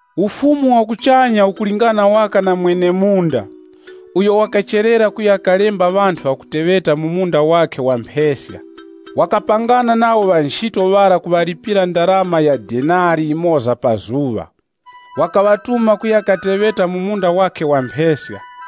“Ufumu wa kuchanya ukulingana waka na mwene-munda uyo wakacherera kuya kalemba ŵanthu ŵakuteŵeta mu munda wakhe wa mpheska. Wakapangana nawo ŵa nchito ŵara kuŵalipira ndarama ya denari yimoza pa zuŵa. Wakaŵatuma kuya kateŵeta mu munda wakhe wa mpheska.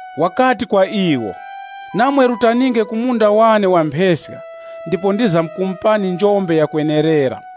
Wakati kwa iwo, ‘Namwe rutaninge ku munda wane wa mpheska ndipo ndizamkumupani njombe yakwenerera.’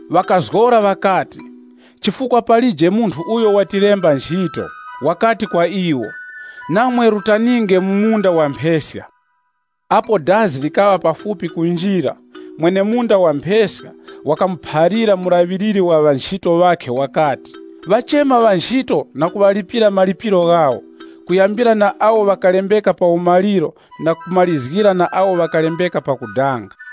Ŵakazgora ŵakati, ‘Chifukwa palije munthu uyo watilemba nchito.’ Wakati kwa iwo, ‘Namwe rutaninge mu munda wa mpheska.’ “Apo dazi likaŵa pafupi kunjira, mwene-munda wa mpheska wakamuphalira mulaŵiliri wa ŵanchito ŵakhe wakati, ‘Ŵachema ŵanchito na kuŵalipira njombe yawo, kuyambira na awo ŵakalembeka pa umaliro na kumarizgira na awo ŵakalembeka pakudanga.’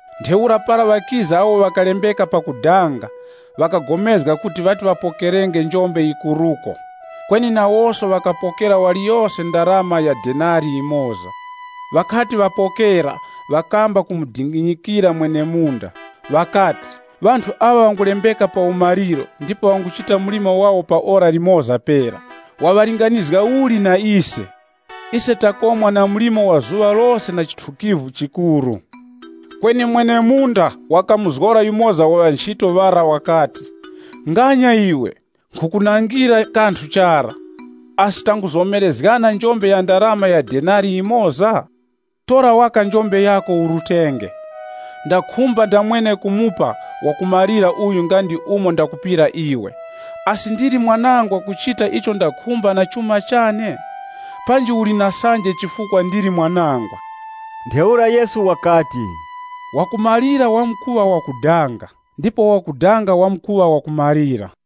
Ntheura para ŵakiza awo ŵakalembeka pakudanga, ŵakagomezga kuti ŵati ŵapokerenge njombe yikuruko. Kweni nawoso ŵakapokera waliyose ndarama ya denari yimoza. Ŵakati ŵapokera, ŵakamba kumudinginyikira mwene-munda, ŵakati, ‘Ŵanthu aŵa ŵangulembeka pa umaliro ndipo ŵanguchita mlimo wawo pa ora limoza pera, waŵalinganizga uli na ise? Ise takomwa na mlimo wa zuŵa lose na chithukivu chikuru.’ Kweni mwene-munda wakamuzgora yumoza wa ŵa nchito ŵara wakati, ‘Nganya iwe, nkhukunangira kanthu chara. Asi tanguzomerezgana njombe ya ndarama ya denari yimoza? Tora waka njombe yako urutenge. Ndakhumba ndamwene kumupa wakumalira uyu nga ndi umo ndakupira iwe. Asi ndili mwanangwa kuchita icho ndakhumba na chuma chane? Panji uli na sanje chifukwa ndili mwanangwa?’” Ntheura Yesu wakati, “Wakumalira wamkuŵa wakudanga, ndipo wakudanga wamkuŵa wakumalira.”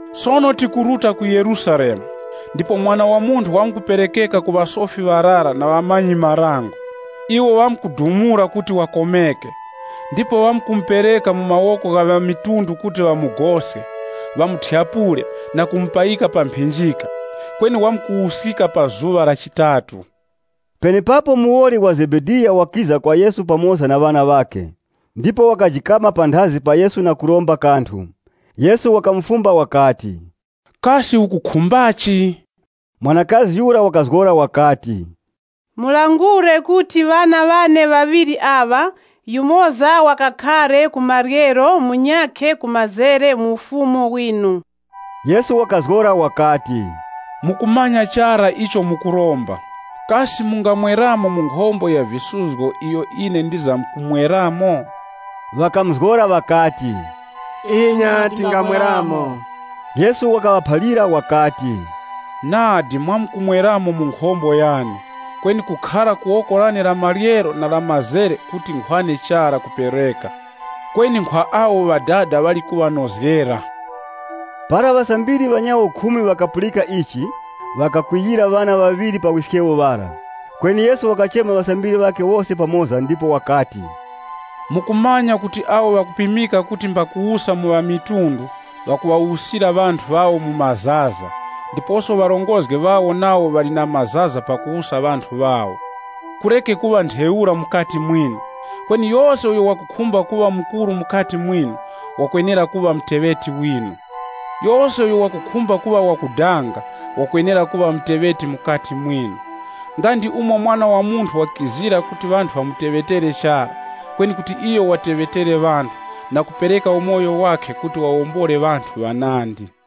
“Sono tikuruta ku Yerusalemu, ndipo Mwana wa Munthu wamkuperekeka ku ŵasofi ŵarara na ŵamanyi-marango. Iwo ŵamkudumula kuti wakomeke. Ndipo ŵamkumupereka mu mawoko gha ŵamitundu kuti ŵamugoske, ŵamuthyapule na kumupayika pa mphinjika, kweni wamkuwuskika pa zuŵa la chitatu.” Penepapo muwoli wa Zebediya wakiza kwa Yesu pamoza na ŵana ŵakhe, ndipo wakajikama panthazi pa Yesu na kuromba kanthu. Yesu wakamufumba wakati, “Kasi ukukhumbachi?” Mwanakazi yura wakazgora wakati, “Mulangure kuti ŵana ŵane ŵaŵiri aŵa, yumoza wakakhare ku maryero munyakhe ku mazere mu Ufumu winu.” Yesu wakazgora wakati, “Mukumanya chara icho mukuromba. Kasi mungamweramo mu nkhombo ya visuzgo iyo ine ndizamkumweramo?” Ŵakamuzgora ŵakati, “Inya tingamweramo.” Yesu wakaŵaphalira wakati, “Nadi, mwamkumweramo mu nkhombo yane, kweni kukhara ku woko lane la maryero na la mazere kuti nkhwane chara kupereka. Kweni nkhwa awo Ŵadada ŵali kuŵanozgera.” Para ŵasambiri ŵanyawo khumi ŵakapulika ichi, ŵakakwiyira ŵana ŵaŵiri pa wiskewo ŵara. Kweni Yesu wakachema ŵasambiri ŵakhe wose pamoza ndipo wakati, “Mukumanya kuti awo ŵakupimika kuti mbakuwusa mu ŵamitundu ŵakuŵawusira ŵanthu ŵawo mu mazaza, ndiposo ŵarongozgi ŵawo nawo ŵali na mazaza pakuwusa ŵanthu ŵawo. Kureke kuŵa ntheura mukati mwinu. Kweni yose uyo wakukhumba kuŵa mukuru mukati mwinu, wakwenera kuŵa muteŵeti winu. Yose uyo wakukhumba kuŵa wakudanga, wakwenera kuŵa muteŵeti mukati mwinu. Nga ndi umo Mwana wa Munthu wakizira kuti ŵanthu ŵamuteŵetere chara, kweni kuti iyo wateŵetere ŵanthu na kupereka umoyo wakhe kuti wawombole ŵanthu ŵanandi.”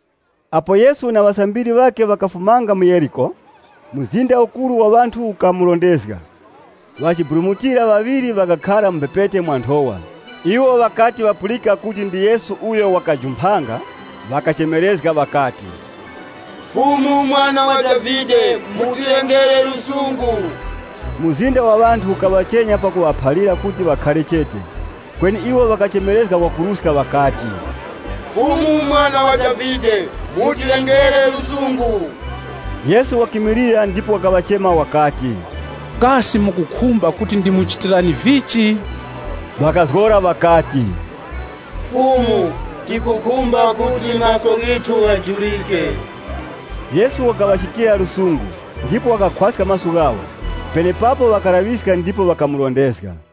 Apo Yesu na ŵasambiri ŵakhe ŵakafumanga mu Yeriko, mzinda ukuru wa ŵanthu ukamurondezga. Ŵachiburumutira ŵaŵiri ŵakakhara mu mphepete mwa nthowa. Iwo ŵakati ŵapulika kuti ndi Yesu uyo wakajumphanga ŵakachemerezga ŵakati, “Fumu, Mwana wa Davide, mutilengere lusungu!” Mzinda wa ŵanthu ukaŵachenya pakuŵaphalira kuti ŵakhare chete. Kweni iwo ŵakachemerezga kwakuruska ŵakati, “Fumu, Mwana wa Davide, mutilengere lusungu!” Yesu wakimilira, ndipo wakaŵachema wakati, “Kasi mukukhumba kuti ndimuchitirani vichi?” Ŵakazgora ŵakati, “Fumu, tikukhumba kuti maso ghithu ghajurike.” Yesu wakaŵa na chiwuravi na iwo, ndipo wakakhwaska maso ghawo. Penepapo ŵakalaŵiska ndipo ŵakamurondezga.